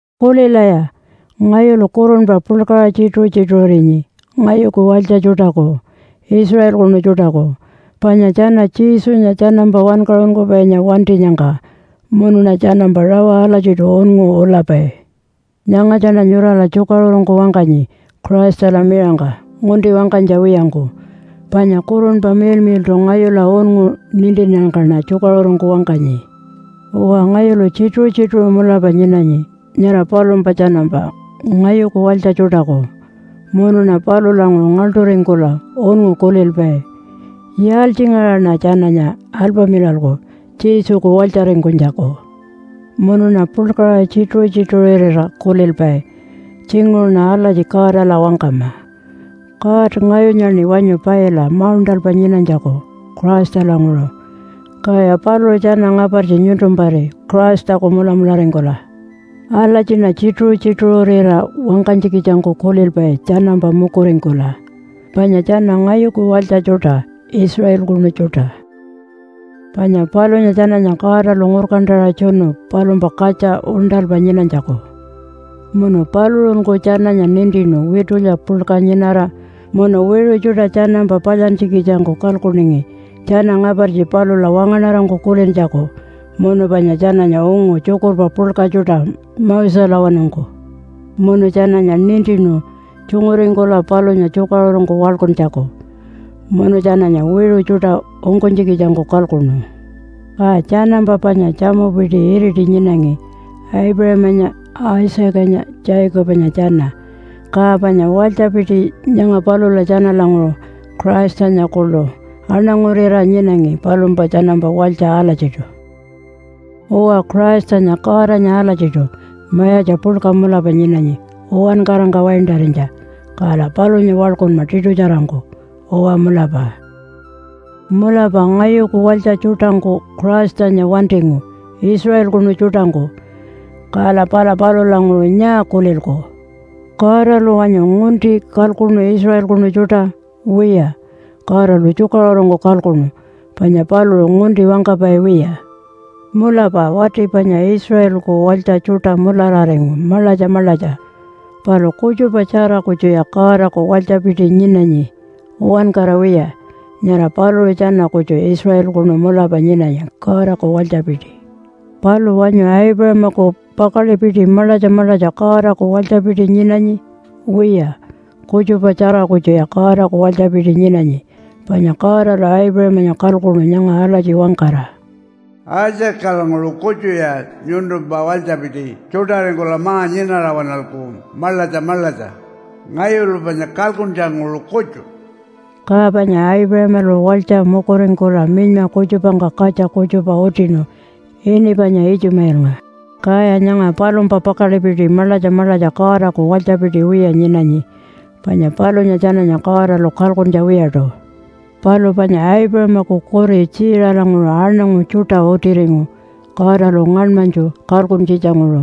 Kulilaya! Ngayulu kurunpa puḻkaṟa tjituṟu-tjituṟurinyi ngayuku walytja tjuṯaku, Israelkunu tjuṯaku, panya tjana Jesunya tjanampa wankaṟunkupainya wantinyangka. Munuṉa tjanampa rawa alatjiṯu unngu ulapai. Nyangatjaṉa nyurala tjukaṟurungku wangkanyi Christala miṟangka ngunti wangkanytja wiyangku. Panya Kurunpa Miḻmiḻṯu ngayula unngu nintinnyangkaṉa tjukaṟurungku wangkanyi. Uwa, ngayulu tjituṟu-tjituṟu mulapa nyinanyi nyara palumpa tjanampa ngayuku walytja tjuṯaku, munuṉa palulanguṟu ngaḻṯuringkula unngu kulilpai, “Yaaltjingaṟaṉa tjananya alpamilalku Jesuku walytjaringkunytjaku?” Munuṉa puḻkaṟa tjituṟu-tjituṟurira kulilpai, “Tjinguṟuṉa alatji Godala wangkama, ‘God, ngayunyaṉi wanyu paila mauṉṯalpa nyinanytjaku Christalanguṟu, kaya paluṟu tjana ngapartji nyuntumpari Christaku mulamularingkula.’” Alatjiṉa tjituṟu-tjituṟurira wangkanytjikitjangku kulilpai tjanampa mukuringkula, panya tjana ngayuku walytja tjuṯa, Israelkunu tjuṯa. Panya palunya tjananya Godalu ngurkantaṟa tjunu palumpa katja uṉṯalpa nyinanytjaku. Munu paluṟunku tjananya nintinu witulya puḻka nyinara, munu wiṟu tjuṯa tjanampa palyantjikitjangku kalkuningi tjana ngapartji palula wangaṉarangku kulintjaku, munu panya tjananya ungu tjukurpa puḻka tjuṯa Moselawanungku. Munu tjananya nintinu tjunguringkula palunya tjukaṟurungku waḻkuntjaku. Munu tjananya wiṟu tjuṯa ungkunytjikitjangku kalkuṉu. Ka tjanampa panya tjamupiti iriti nyinangi Aipuṟamanya, Isaacanya, Jacobanya tjana. Ka panya walytjapiti nyanga palula tjanalanguṟu Christanya kuḻu aṉangurira nyinangi palumpa tjanampa walytja alatjiṯu. Uwa, Christanya Godanya alatjiṯu mayatja puḻka mulapa nyinanyi uwankarangka waintarinytja, kala palunya waḻkunma tiṯutjarangku. Uwa mulapa. Mulapa ngayuku walytja tjuṯangku Christanya wantingu, Israelkunu tjuṯangku. Kala pala palulanguṟu nyaa kulilku? Godalu wanyu ngunti kalkuṉu Israelkunu tjuṯa? Wiya, Godalu tjukaṟurungku kalkuṉu, panya paluṟu ngunti wangkapai wiya. Mulapa wati panya Israelku walytja tjuṯa mulararingu maḻatja maḻatja, palu kutjupatjara kutjuya Godaku walytjapiti nyinanyi, uwankara wiya. Nyara paluṟu tjana kutju Israelkunu mulapa nyinanyi Godaku walytjapiti. Palu wanyu Aipuṟamaku pakaḻipiti maḻatja maḻatja Godaku walytjapiti nyinanyi? Wiya, kutjupatjara kutjuya Godaku walytjapiti nyinanyi. Panya Godalu Aipuṟamanya kalkuṉu nyanga alatji wangkara, “Isaacalanguṟu kutjuya nyuntumpa walytjapiti tjuṯaringkula ma-nyinara waṉalku maḻatja maḻatja, ngayulu panya kalkuntjanguṟu kutju.” Ka panya Aipuṟamalu walytja mukuringkula minyma kutjupangka katja kutjupa utinu ini panya Itjumailnga, kaya nyanga palumpa pakaḻipiti maḻatja maḻatja Godaku walytjapiti wiya nyinanyi, panya palunya tjananya Godalu kalkuntja wiyaṯu. Palu panya Aipuṟamaku kuri Tjiiṟalanguṟu aṉangu tjuṯa utiringu Godalu ngaṉmanytju kalkuntjitjanguṟu,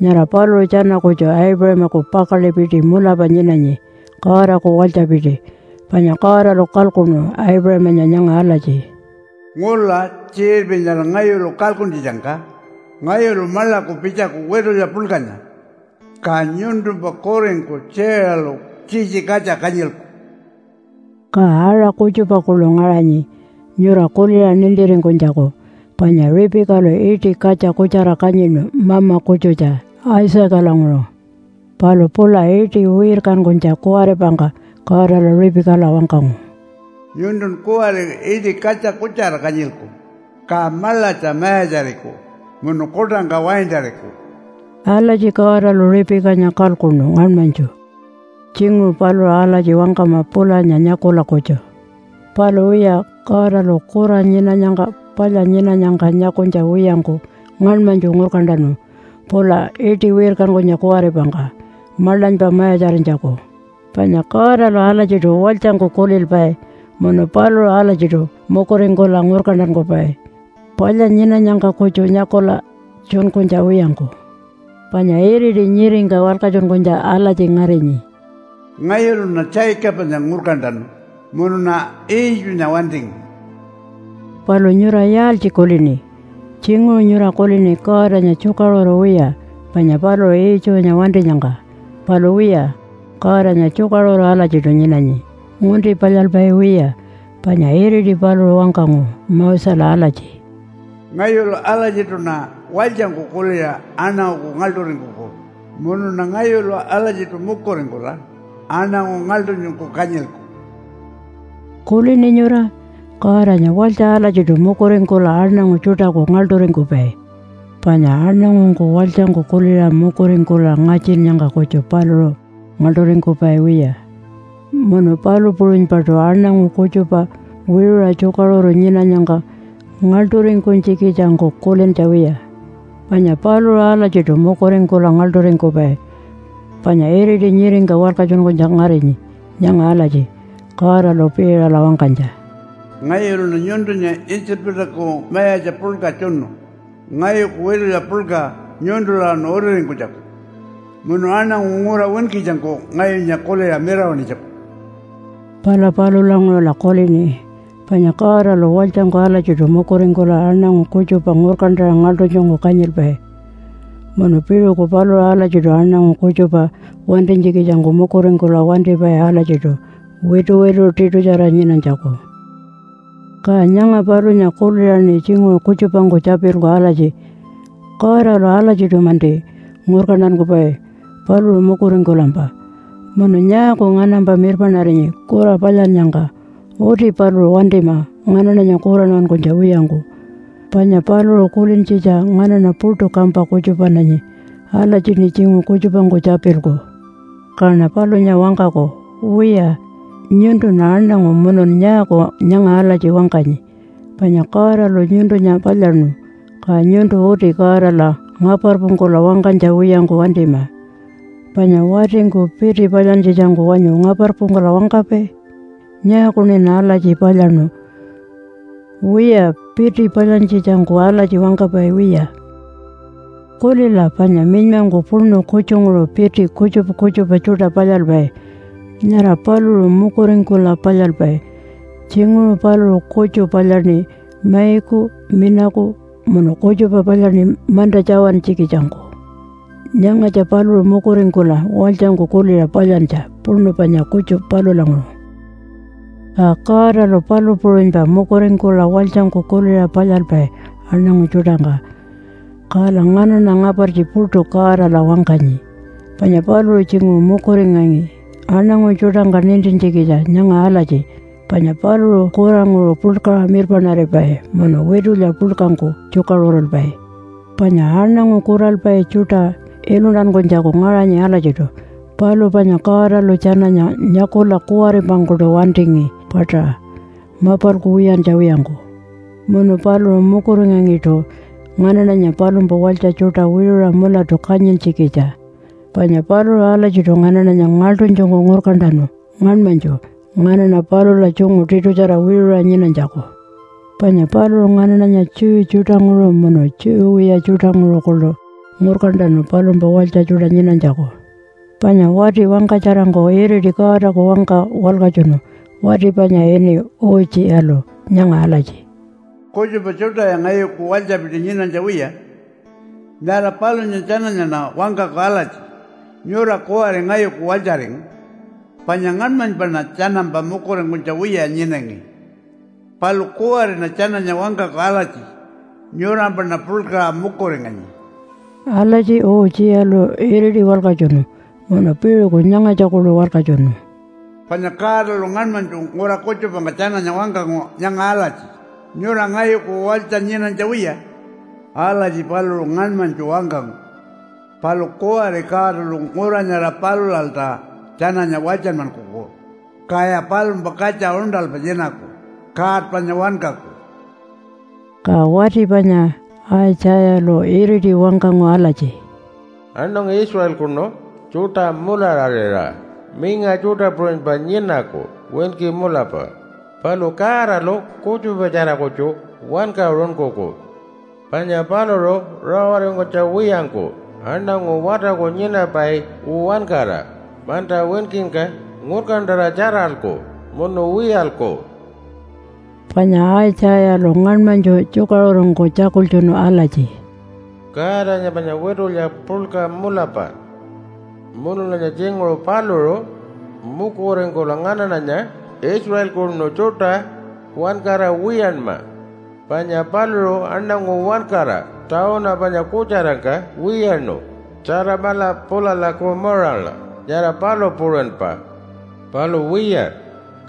nyara paluṟu tjana kutju Aipuṟamaku pakaḻipiti mulapa nyinanyi, Godaku walytjapiti. Panya Godalu kalkuṉu Aipuṟamanya nyanga alatji, “Ngula tjiṟirpi nyara ngayulu kalkuntjitjangka ngayulu maḻaku pitjaku witulya puḻkanya, ka nyuntumpa kuringku Tjiiṟalu tjitji katja kanyilku.” Ka aṟa kutjupa kuḻu ngaṟanyi nyura kuliṟa nintiringkunytjaku, panya Ripikalu iṯi katja kutjara kanyinu mama kutjutja Isaacalanguṟu. Palu pula iṯi wirkankunytja kuwaripangka Godalu Ripikala wangkangu, “Nyuntun kuwari iṯi katja kutjara kanyilku, ka maḻatja mayatjariku munu kuṯangka waintariku.” Alatji Godalu Ripikanya kalkuṉu ngaṉmanytju. Tjinguṟu paluṟu alatji wangkama pulanya nyakula kutju. Palu wiya, Godalu kura nyinanyangka palya nyinanyangka nyakunytja wiyangku ngaṉmanytju ngurkantanu pula iṯi wirkankunytja kuwaripangka maḻanypa mayatjarinytjaku. Panya Godalu alatjiṯu walytjangku kulilpai munu paluṟu alatjiṯu mukuringkula ngurkantankupai, palya nyinanyangka kutju nyakula tjunkunytja wiyangku. Panya iriti nyiringka walkatjunkunytja alatji ngarinyi, “Ngayuluṉa Jacobanya ngurkantanu munuṉa Iitjunya wantingu.” Palu nyura yaaltji kulini? Tjinguṟu nyura kulini Godanya tjukaṟuru wiya panya paluṟu Iitjunya wantinyangka. Palu wiya, Godanya tjukaṟuru alatjiṯu nyinanyi ngunti palyalpai wiya. Panya iriti paluṟu wangkangu Mosela alatji, “Ngayulu alatjiṯuṉa walytjangku kuliṟa aṉanguku ngaḻṯuringkuku. Munuṉa ngayulu alatjiṯu mukuringkula aṉangu ngaḻṯunytjungku kanyilku.” Kulini nyura? Godanya walytja alatjiṯu mukuringkula aṉangu tjuṯaku ngaḻṯuringkupai. Panya aṉangungku walytjangku kuliṟa mukuringkula ngatjinnyangka kutju paluṟu ngaḻṯuringkupai wiya. Munu palu puṟunypaṯu aṉangu kutjupa wiṟuṟa tjukaṟuru nyinanyangka ngaḻṯuringkunytjikitjangku kulintja wiya. Panya paluṟu alatjiṯu mukuringkula ngaḻṯuringkupai. Panya iriti nyiringka walkatjunkunytja ngarinyi nyanga alatji Godalu Piiṟala wangkanytja, “Ngayuluṉa nyuntunya Itjipaku mayatja puḻka tjunu ngayuku witulya puḻka nyuntulawanu utiringkunytjaku munu aṉangu ngura winkitjangku ngayunya kuliṟa mirawaṉinytjaku.” Pala palulanguṟula kulini panya Godalu walytjangku alatjiṯu mukuringkula aṉangu kutjupa ngurkantaṟa ngaḻṯunytjungku kanyilpai, munu piṟuku paluṟu alatjiṯu aṉangu kutjupa wantinytjikitjangku mukuringkula wantipai alatjiṯu wituwitu tiṯutjara nyinanytjaku. Ka nyanga palunya kuliṟaṉi tjinguṟu kutjupangku tjapilku alatji, “Godalu alatjiṯu-manti ngurkantankupai paluṟu mukuringkulampa. Munu nyaaku nganampa mirpaṉarinyi kura palyannyangka? Uti paluṟu wantima nganaṉanya kuranmankunytja wiyangku, panya paluṟu kulintjitja nganaṉa puṯu kampa kutjupananyi.” Alatjiṉi tjinguṟu kutjupangku tjapilku. Kaṉa palunya wangkaku, “Wiya, nyuntun aṉangu munun nyaaku nyanga alatji wangkanyi, panya Godalu nyuntunya palyaṉu, ka nyuntu uti Godala ngaparpungkula wangkanytja wiyangku wantima. Panya watingku piti palyantjitjangku wanyu ngaparpungkula wangkapai, ‘Nyaakuṉin alatji palyaṉu?’ Wiya, piti palyantjitjangku alatji wangkapai wiya. “Kulila, panya minymangku puṉu kutjunguṟu piti kutjupa kutjupa tjuṯa palyalpai. Nyara paluṟu mukuringkula palyalpai. Tjinguṟu paluṟu kutju palyaṉi maiku minaku munu kutjupa palyaṉi manta tjawantjikitjangku. Nyangatja paluṟu mukuringkula walytjangku kuliṟa palyantja puṉu panya kutju palulanguṟu.” Ka Godalu palu puṟunypa mukuringkula walytjangku kuliṟa palyalpai aṉangu tjuṯangka. Kala nganaṉa ngapartji puṯu Godala wangkanyi, panya paluṟu tjinguṟu mukuringangi aṉangu tjuṯangka nintintjikitja nyanga alatji, panya paluṟu kuranguṟu puḻkaṟa mirpaṉaripai munu witulya puḻkangku tjukaṟurulpai. Panya aṉangu kuralpai tjuṯa iluntankunytjaku ngaṟanyi alatjiṯu. Palu panya Godalu tjananya nyakula kuwaripangkuṯu wantingi paṯaṟa mapalku wiyantja wiyangku. Munu paluṟu mukuringangiṯu nganaṉanya, palumpa walytja tjuṯa, wiṟuṟa mulatu kanyintjikitja. Panya paluṟu alatjiṯu nganaṉanya ngaḻṯunytjungku ngurkantanu ngaṉmanytju, nganaṉa palula tjungu tiṯutjara wiṟuṟa nyinanytjaku. Panya paluṟu nganaṉanya Jew tjuṯanguṟu munu Jew wiya tjuṯanguṟu kuḻu ngurkantanu palumpa walytja tjuṯa nyinanytjaku. Panya wati wangkatjarangku iriti Godaku wangka walkatjunu wati panya ini Utjiyalu nyanga alatji, “Kutjupa tjuṯaya ngayuku walytjapiti nyinanytja wiya. Nyara palunya tjananyaṉa wangkaku alatji, ‘Nyura kuwari ngayuku walytjaringu!’ Panya ngaṉmanypaṉa tjanampa mukuringkunytja wiya nyinangi, palu kuwariṉa tjananya wangkaku alatji, ‘Nyurampaṉa puḻkaṟa mukuringanyi.’” Alatji Utjiyalu iriti walkatjunu. Munu piṟuku nyangatja kuḻu walkatjunu. “Panya Godalu ngaṉmanytju ngura kutjupangka tjananya wangkangu nyanga alatji, ‘Nyura ngayuku walytja nyinanytja wiya.’ Alatji paluṟu ngaṉmanytju wangkangu. Palu kuwari Godalu ngura nyara palulalta tjananya walytjanmankuku, kaya palumpa katja uṉṯalpa nyinaku God panya wankaku.” Ka wati panya Aitjayalu iriti wangkangu alatji, “Aṉangu Israelkunu tjuṯa mulararira, minga tjuṯa puṟunypa nyinaku, winki mulapa. Palu Godalu kutjupatjara kutju wankaṟunkuku. Panya paluṟu rawaringkunytja wiyangku aṉangu watarku nyinapai uwankara manta winkingka ngurkantaṟa tjaralku munu wiyalku.” Panya Aitjayalu ngaṉmanytju tjukaṟurungku tjakultjunu alatji, “Godanya panya witulya puḻka mulapa, munulanya tjinguṟu paluṟu mukuringkula nganaṉanya Israelkunu tjuṯa uwankara wiyanma, panya paluṟu aṉangu uwankara tawunu panya kutjarangka wiyaṉu Tjatamala pulala Kumarala, nyara palu puṟunypa. Palu wiya,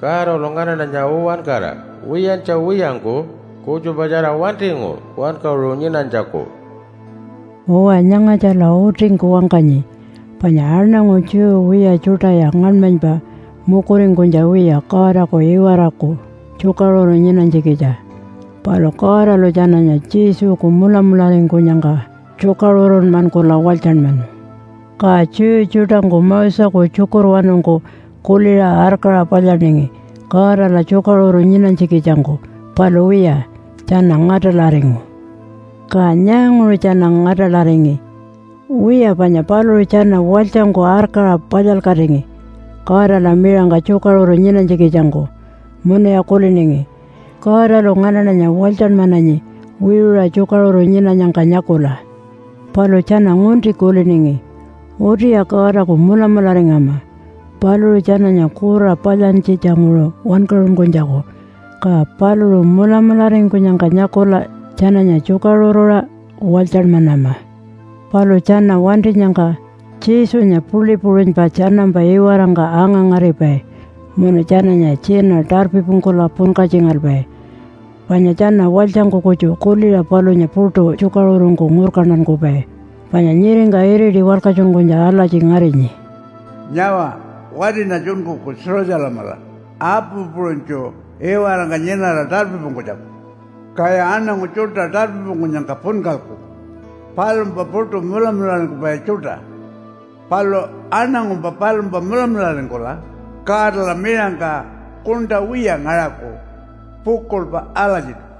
Godalu nganaṉanya uwankara wiyantja wiyangku kutjupatjara wantingu wankaṟu nyinanytjaku.” Uwa, nyangatjala utingku wangkanyi. Panya aṉangu Jew wiya tjuṯaya ngaṉmanypa mukuringkunytja wiya Godaku iwaraku tjukaṟuru nyinanytjikitja. Palu Godalu tjananya Jesuku mulamularingkunyangka tjukaṟurunmankula walytjanmanu. Ka Jew tjuṯangku Moseku tjukurwanungku kuliṟa arkaṟa palyaningi Godala tjukaṟuru nyinanytjikitjangku, palu wiya tjana ngaṯalaringu. Ka nyaanguṟu tjana ngaṯalaringi? Wiya, panya paluṟu tjana walytjangku arkaṟa palyalkatingi Godala miṟangka tjukaṟuru nyinanytjikitjangku, munuya kuliningi, “Godalu nganaṉanya walytjanmananyi wiṟuṟa tjukaṟuru nyinanyangka nyakula.” Palu tjana ngunti kuliningi. Utiya Godaku mulamularingama paluṟu tjananya kura palyantjitjanguṟu wankaṟunkunytjaku, ka paluṟu mulamularingkunyangka nyakula tjananya tjukaṟuruṟa walytjanmanama. Palu tjana wantinyangka Jesunya puḻi puṟunypa tjanampa iwarangka anga-ngaripai munu tjananya tjina tarpipungkula punkatjingalpai, panya tjana walytjangku kutju kuliṟa palunya puṯu tjukaṟurungku ngurkantankupai. Panya nyiringka iriti walkatjunkunytja alatji ngarinyi, “Nyawa, watiṉa tjunkuku Jerusalemala apu puṟunytju iwarangka nyinara tarpipungkunytjaku. Kaya aṉangu tjuṯa tarpipungkunyangka punkalku palumpa puṯu mulamularingkupai tjuṯa. Palu aṉangumpa palumpa mulamularingkula Godala miṟangka kuṉṯa wiya ngaṟaku pukuḻpa alatjiṯu.”